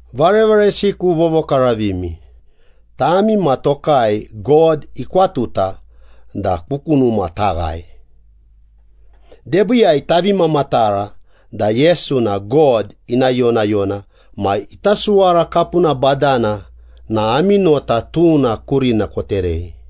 Varevaresiku vovokaravimi, tami ma tokai God ikwatuta da ku kunuma taghae. Debiiyai tavi mamatara da Yesu na God ina yonayona ma ita suwara kapuna badana na ami nota tuna kurina koterei.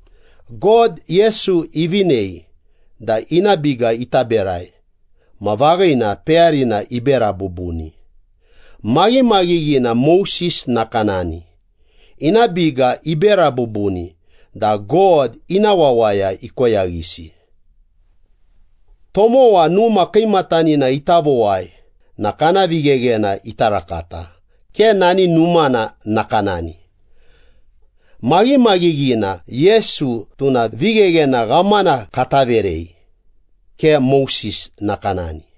God, Yesu ivinei da ina biga ita berai ma vaghina peyarina ibera bubuni. Maghimaghighina Moses nakanani, ina biga ibera bubuni da God ina wawaya ikoyaghisi. Tomowa numa kiimatanina ita vowai na kana vigheghena ita rakata, ke nani numana nakanani. Maghimaghighina, Yesu tuna vigheghena ghamana kata verei, ke Moses nakanani.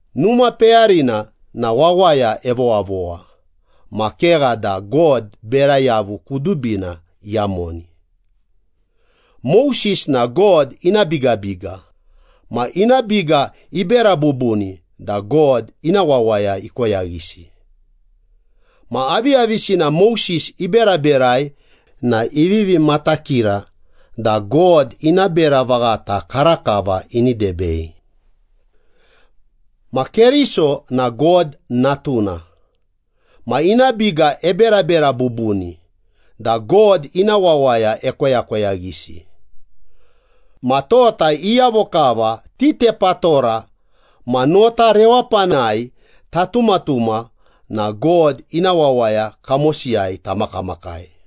Numa peyarina na wawaya evowavowa, ma kegha da God bera yavu kudubina iyamoni. Moses na God ina bigabiga, ma ina biga ibera bubuni da God ina wawaya ikoyaghisi. Ma aviyavisina Moses iberaberai na ivivi matakira da God ina bera vaghata karakava ini debei. Ma Keriso na God Natuna, ma ina biga eberabera bubuni da God ina wawaya ekoyakoyaghisi. Ma tota iyavo kava titepatora ma nota rewapanai tatumatuma na God ina wawaya kamosiyai tamakamakai.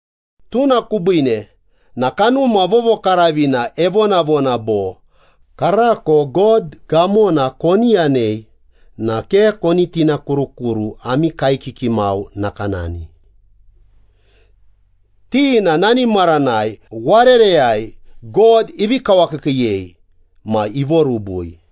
Tuna kubiine na Kanuma Vovokaravina evonavona bo, “Karako God gamona koni yanei, na ke koni tinakurukuru ami kaekiki mau nakanani. Ti na nani maranai warereyai God ivi kawakiikiiyei ma ivorubui.”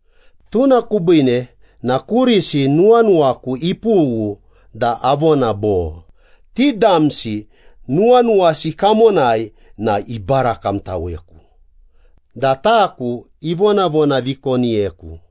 Tuna kubiine na kurisi nuwanuwaku ipughu da avona bo, ‘Ti damsi nuwanuwasi kamonai na ibarakamtaweku da taku ivonavonavikoniyeku.’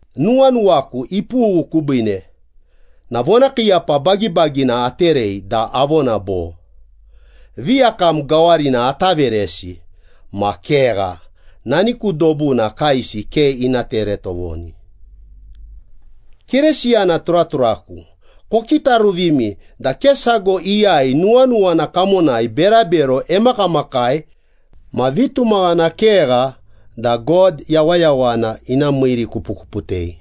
Nuwanuwaku ipughu kubiine na vonakiiyapa bagibagina aterei da avona bo, ‘Viyakam gawarina ata veresi ma kegha, nani ku dobuna kaesi ke ina tere tovoni.’” Keresiyana turaturaku, kokitaruvimi da ke sago iyai nuwanuwana kamonai berabero emakamakai ma vitumaghana kegha da God yawayawana ina miirikupukuputei.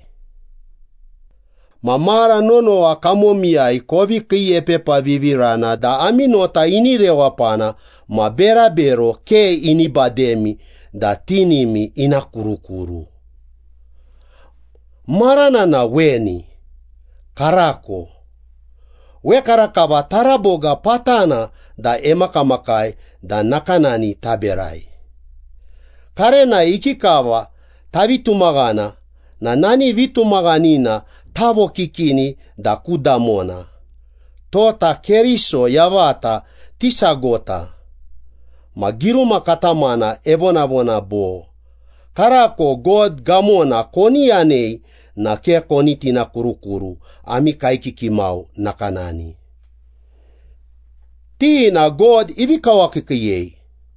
Ma mara nonowa kamomiyai kovi kiiepepavivirana da ami nota ini rewapana ma berabero ke ini bademi da tinimi ina kurukuru. Marana na weni, ‘Karako,’ wekarakava taraboga patana da emakamakai da nakanani taberai. Karenai ikikava tavi tumaghana na nani vitumaghanina tavokikini da ku damona, tota Keriso yavata tisagota. Ma giruma katamana evonavona bo, “Karako God gamona koni yanei, na ke koni tinakurukuru ami kaekiki mau nakanani. Ti na God ivi kawakiikiiyei.”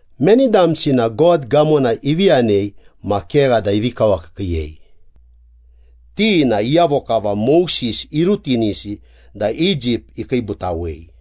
Meni damsi na God gamona ivi yanei ma kegha da ivi kawakiikiiyei? Ti na iyavo kava Moses irutinisi da Egypt ikiibutawei.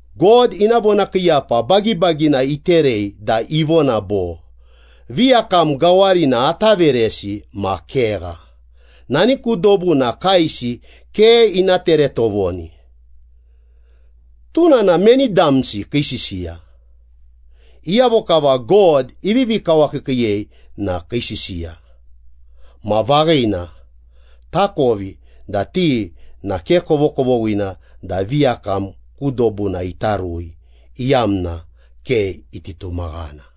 God ina vonakiiyapa bagibagina iterei da ivona bo, “Viyakam gawarina ata veresi ma kegha, nani ku dobuna kaesi ke ina tere tovoni.” Tuna na meni damsi kii sisiya? Iyavo kava God ivivi kawakiikiiyei na kii sisiya. Ma vaghina, takovi da ti na ke kovokovoghina da viyakam ku dobuna ita rui, iyamna ke iti tumaghana.